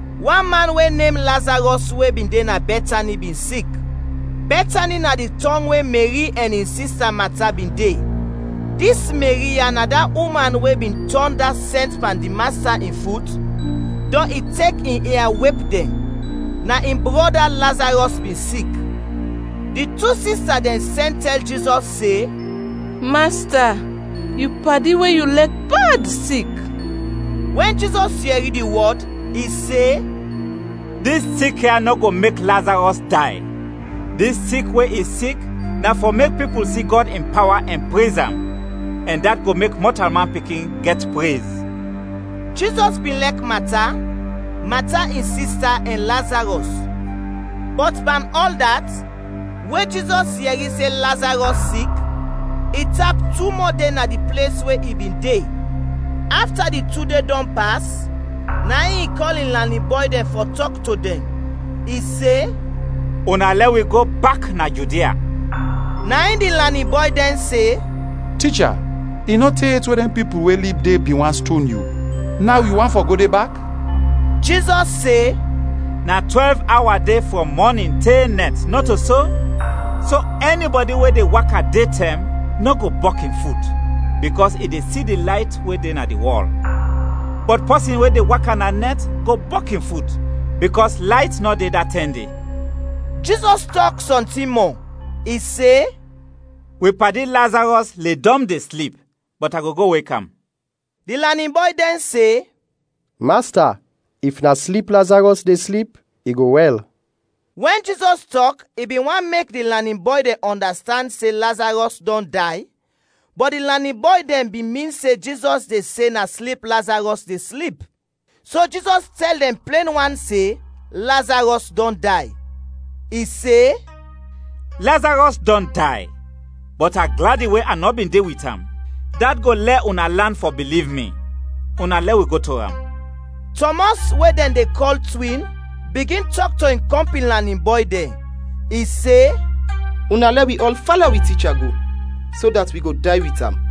Wan man we nem Lazarɔs we bin de na Bɛtani bin sik. Bɛtani na di tɔng we Meri ɛn in sista Mata bin de. (Dis Meri ya na da uman we bin tɔn da sɛnt pan di Masta in fut, dɔn i tek in ia wep dɛn. Na in brɔda, Lazarɔs, bin sik.) Di tu sista dɛn sɛn tɛl Jizɔs se, “Masta, yu padi we yu lɛk bad, sik.” Wɛn Jizɔs yɛri di wɔd, i se, “Dis sik ya nɔ go mek Lazarɔs day, dis sik we i sik na fɔ mek pipul si Gɔd in pawa ɛn prez am, ɛn dat go mek Mɔtalman Pikin gɛt prez.” Jizɔs bin lɛk Mata, Mata in sista ɛn Lazarɔs. Bɔt pan ɔl dat, we Jizɔs yɛri se Lazarɔs sik, i tap tu mɔ de na di ples we i bin de. Afta di tu de dɔn pas, na in i kɔl in lanin bɔy dɛn fɔ tɔk to dɛn. I se, “Una lɛ wi go bak na Judia.” Na in di lanin bɔy dɛn se, “Ticha, i nɔ te yet we dɛn pipul we lib de bin want ston yu; naw yu want fɔ go de bak?” Jizɔs se, “Na twɛlv awa de frɔm mɔnin te nɛt, nɔto so? So ɛnibɔdi we de waka detɛm, nɔ go bɔk in fut, bikɔs i de si di layt we de na di wɔl. Bɔt pɔsin we de waka na nɛt, go bɔk in fut, bikɔs layt nɔ de da tɛm de.” Jizɔs tɔk sɔntin mɔ, i se, “Wi padi, Lazarɔs, ledɔm de slip, bɔt a go go wek am.” Di lanin bɔy dɛn se, “Masta, if na slip Lazarɔs de slip, i go wɛl.” Wɛn Jizɔs tɔk i bin want mek di lanin bɔy dɛn ɔndastand se Lazarɔs dɔn day, bɔt di lanin bɔy dɛn bin min se Jizɔs de se na slip Lazarɔs de slip. So Jizɔs tɛl dɛn plen wan se, Lazarɔs dɔn day. I se, “Lazarɔs dɔn day, bɔt a gladi we a nɔ bin de wit am; dat go lɛ una lan fɔ biliv mi. Una lɛ wi go to am.” Tɔmɔs, we dɛn de kɔl Twin, bigin tɔk to in kɔmpin lanin bɔy dɛn. I se, “Una lɛ wi ɔl fala wi ticha go, so dat wi go day wit am.”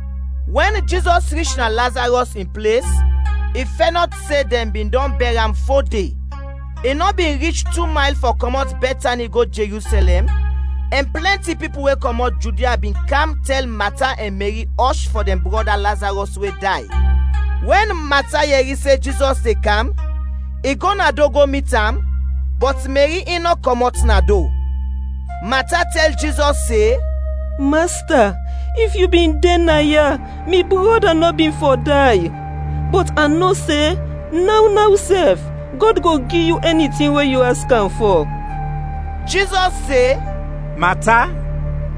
Wɛn Jizɔs rich na Lazarɔs in ples, i fɛnɔt se dɛn bin dɔn bɛr am fo de. I nɔ bin rich tu mayl fɔ kɔmɔt Bɛtani go Jerusɛlɛm, ɛn plɛnti pipul we kɔmɔt Judia bin kam tɛl Mata ɛn Meri ɔsh fɔ dɛn brɔda Lazarɔs we day. Wɛn Mata yɛri se Jizɔs de kam, i go na do go mit am, bɔt Meri in nɔ kɔmɔt na do. Mata tɛl Jizɔs se, “Masta, if yu bin de naya, mi brɔda nɔ bin fɔ day! Bɔt a no se naw, naw sɛf, Gɔd go gi yu ɛni tin we yu aks am fɔ.” Jizɔs se, “Mata,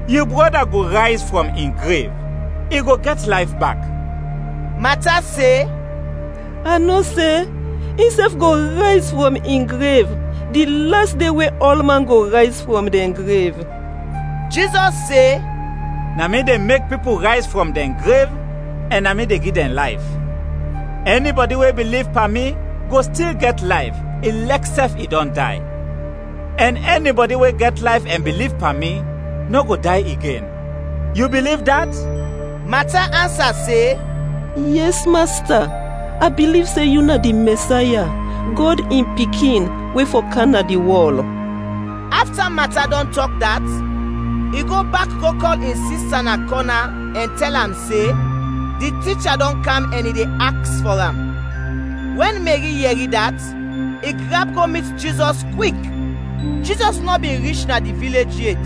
yu brɔda go rayz frɔm in grev, i go gɛt layf bak.” Mata se, “A no se, insɛf go rayz frɔm in grev di las de we ɔlman go rayz frɔm dɛn grev.” Jizɔs se, “Na mi de mek pipul rayz frɔm dɛn grev ɛn na mi de gi dɛn layf. Ɛnibɔdi we biliv pan mi, go stil gɛt layf, i lɛk sɛf i dɔn day, ɛn ɛnibɔdi we gɛt layf ɛn biliv pan mi, nɔ go day igen. Yu biliv dat?” Mata ansa se, “Yɛs, Masta, a biliv se yu na di Mɛsaya, Gɔd in Pikin, we fɔ kam na di wɔl.” Afta Mata dɔn tɔk dat, i go bak go kɔl in sista na kɔna, ɛn tɛl am se, di ticha dɔn kam ɛn i de aks fɔ am. Wɛn Meri yɛri dat, i grap go mit Jizɔs kwik. (Jizɔs nɔ bin rich na di vilej yet,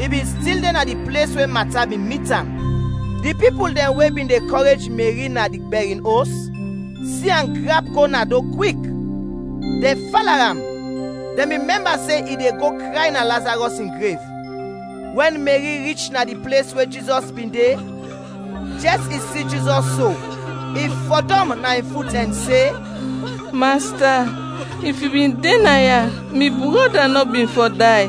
i bin stil de na di ples we Mata bin mit am.) Di pipul dɛn we bin de kɔrej Meri na di bɛrin os si am grap go na do kwik, dɛn fala am. Dɛn bin mɛmba se i de go kray na Lazarɔs in grev. Wɛn Meri rich na di ples we Jizɔs bin de, jɛs i si Jizɔs so, i fɔdɔm na in fut ɛn se, “Masta, if yu bin de naya, mi brɔda nɔ bin fɔ day!”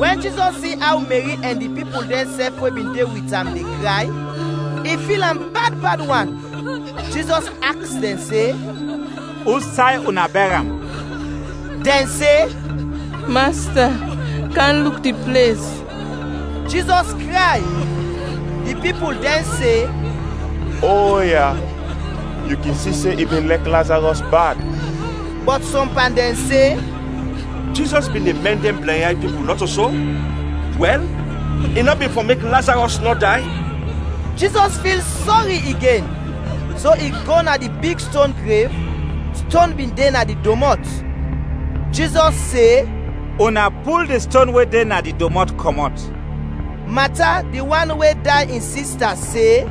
Wɛn Jizɔs si aw Meri ɛn di pipul dɛnsɛf we bin de wit am, de kray, i fil am bad bad wan. Jizɔs aks dɛn se, “Usay una bɛr am?” Dɛn se, “Masta, kam luk di ples.” Jizɔs kray. Di pipul dɛn se, “Oya, yu kin si se i bin lɛk Lazarɔs bad.” Bɔt sɔm pan dɛn se, “Jizɔs bin de mɛn dɛn blɛnyay pipul, nɔto so? Wɛl, i nɔ bin fɔ mek Lazarɔs nɔ day?” Jizɔs fil sɔri igen, so i go na di big ston grev; ston bin de na di domɔt. Jizɔs se, “Una pul di ston we de na di domɔt, kɔmɔt!” Mata, di wan we day in sista, se,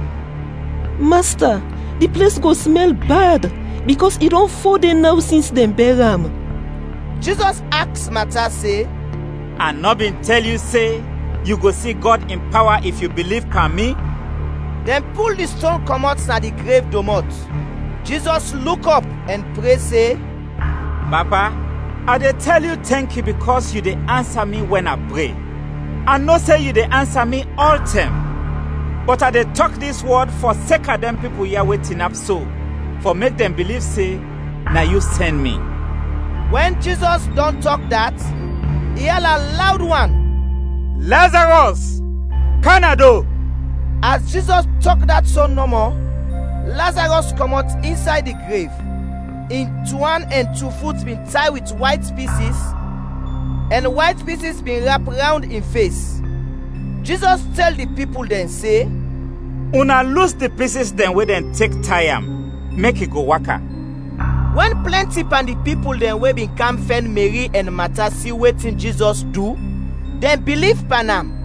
“Masta, di ples go smɛl bad bikɔs i dɔn fo de naw sins dɛn bɛr am!” Jizɔs aks Mata se, “A nɔ bin tɛl yu se, yu go si Gɔd in pawa, if yu biliv pan mi?” Dɛn pul di ston kɔmɔt na di grev domɔt. Jizɔs luk ɔp ɛn pre se, “Papa, a de tɛl yu tɛnki bikɔs yu de ansa mi wɛn a pre. A no se yu de ansa mi ɔltɛm, bɔt a de tɔk dis wɔd fɔseka dɛn pipul ya we tinap so, fɔ mek dɛn biliv se, na yu sɛn mi.” Wɛn Jizɔs dɔn tɔk dat, i ala lawd wan, “Lazarɔs, kam na do!” As Jizɔs tɔk dat so nɔmɔ, Lazarɔs kɔmɔt insay di grev. In tu an ɛn tu fut bin tay wit wayt pisis, ɛn wayt pisis bin rap rawnd in fes. Jizɔs tɛl di pipul dɛn se, “Una lus di pisis dɛn we dɛn tek tay am, mek i go waka.” Wɛn plɛnti pan di pipul dɛn we bin kam fɛn Meri ɛn Mata si wetin Jizɔs du, dɛn biliv pan am.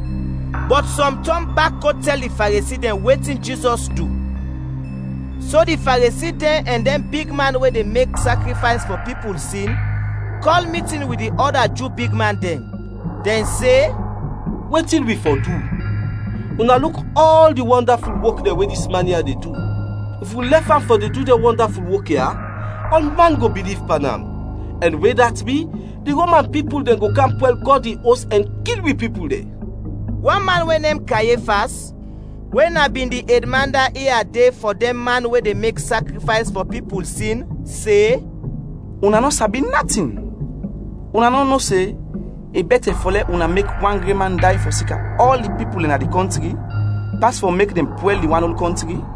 Bɔt sɔm tɔn bak go tɛl di Faresi dɛn wetin Jizɔs du. So di Faresi dɛn ɛn dɛn bigman we de mek sakrifays fɔ pipul sin kɔl mitin wit di ɔda Ju bigman dɛn. Dɛn se, “Wetin wi fɔ du? Una luk ɔl di wɔndaful wok dɛn we dis man ya de du! If wi lɛf am fɔ de du dɛn wɔndaful wok ya, ɔlman go biliv pan am, ɛn wɛn dat bi, di Roman pipul dɛn go kam pwɛl Gɔd in Os ɛn kil wi pipul dɛn.” Wan man we nem Kayefas, we na bin di edman da ia de fɔ dɛn man we de mek sakrifays fɔ pipul sin, se, “Una nɔ sabi natin! Una nɔ no se, i bɛtɛ fɔ lɛ una mek wan gren man day fɔseka ɔl di pipul dɛn na di kɔntri, pas fɔ mek dɛn pwɛl di wan ol kɔntri?”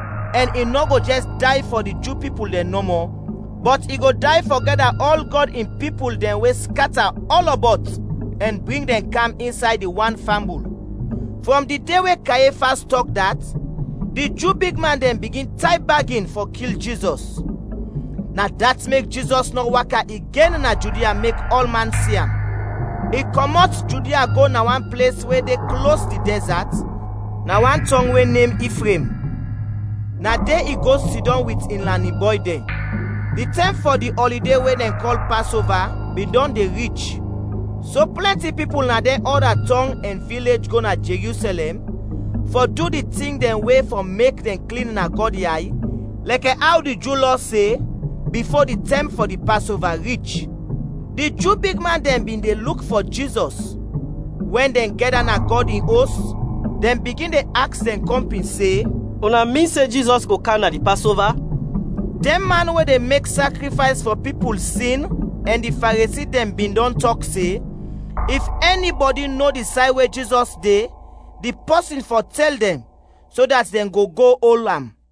ɛn i nɔ go jɛs day fɔ di Ju pipul dɛn nɔmɔ, bɔt i go day fɔ gɛda ɔl Gɔd in pipul dɛn we skata ɔlɔbɔt ɛn bring dɛn kam insay di wan fambul. Frɔm di de we Kayefas tɔk dat, di Ju bigman dɛn bigin tay bagin fɔ kil Jizɔs. Na dat mek Jizɔs nɔ waka igen na Judia mek ɔlman si am. I kɔmɔt Judia go na wan ples we de klos di dɛzat, na wan tɔng we nem Ifraim, na de i go sidɔm wit in lanin bɔy dɛn. Di tɛm fɔ di ɔlide we dɛn kɔl Pasova bin dɔn de rich, so plɛnti pipul na dɛn ɔda tɔng ɛn vilej go na Jerusɛlɛm, fɔ du di tin dɛn we fɔ mek dɛn klin na Gɔd yay lɛkɛ aw di Ju Lɔ se, bifo di tɛm fɔ di Pasova rich. Di Ju bigman dɛn bin de luk fɔ Jizɔs; wɛn dɛn gɛda na Gɔd in Os, dɛn bigin de aks dɛn kɔmpin se, “Una min se Jizɔs go kam na di Pasova?” Dɛn man we de mek sakrifays fɔ pipul sin ɛn di Faresi dɛn bin dɔn tɔk se, if ɛnibɔdi no di say we Jizɔs de, di pɔsin fɔ tɛl dɛn, so dat dɛn go go ol am.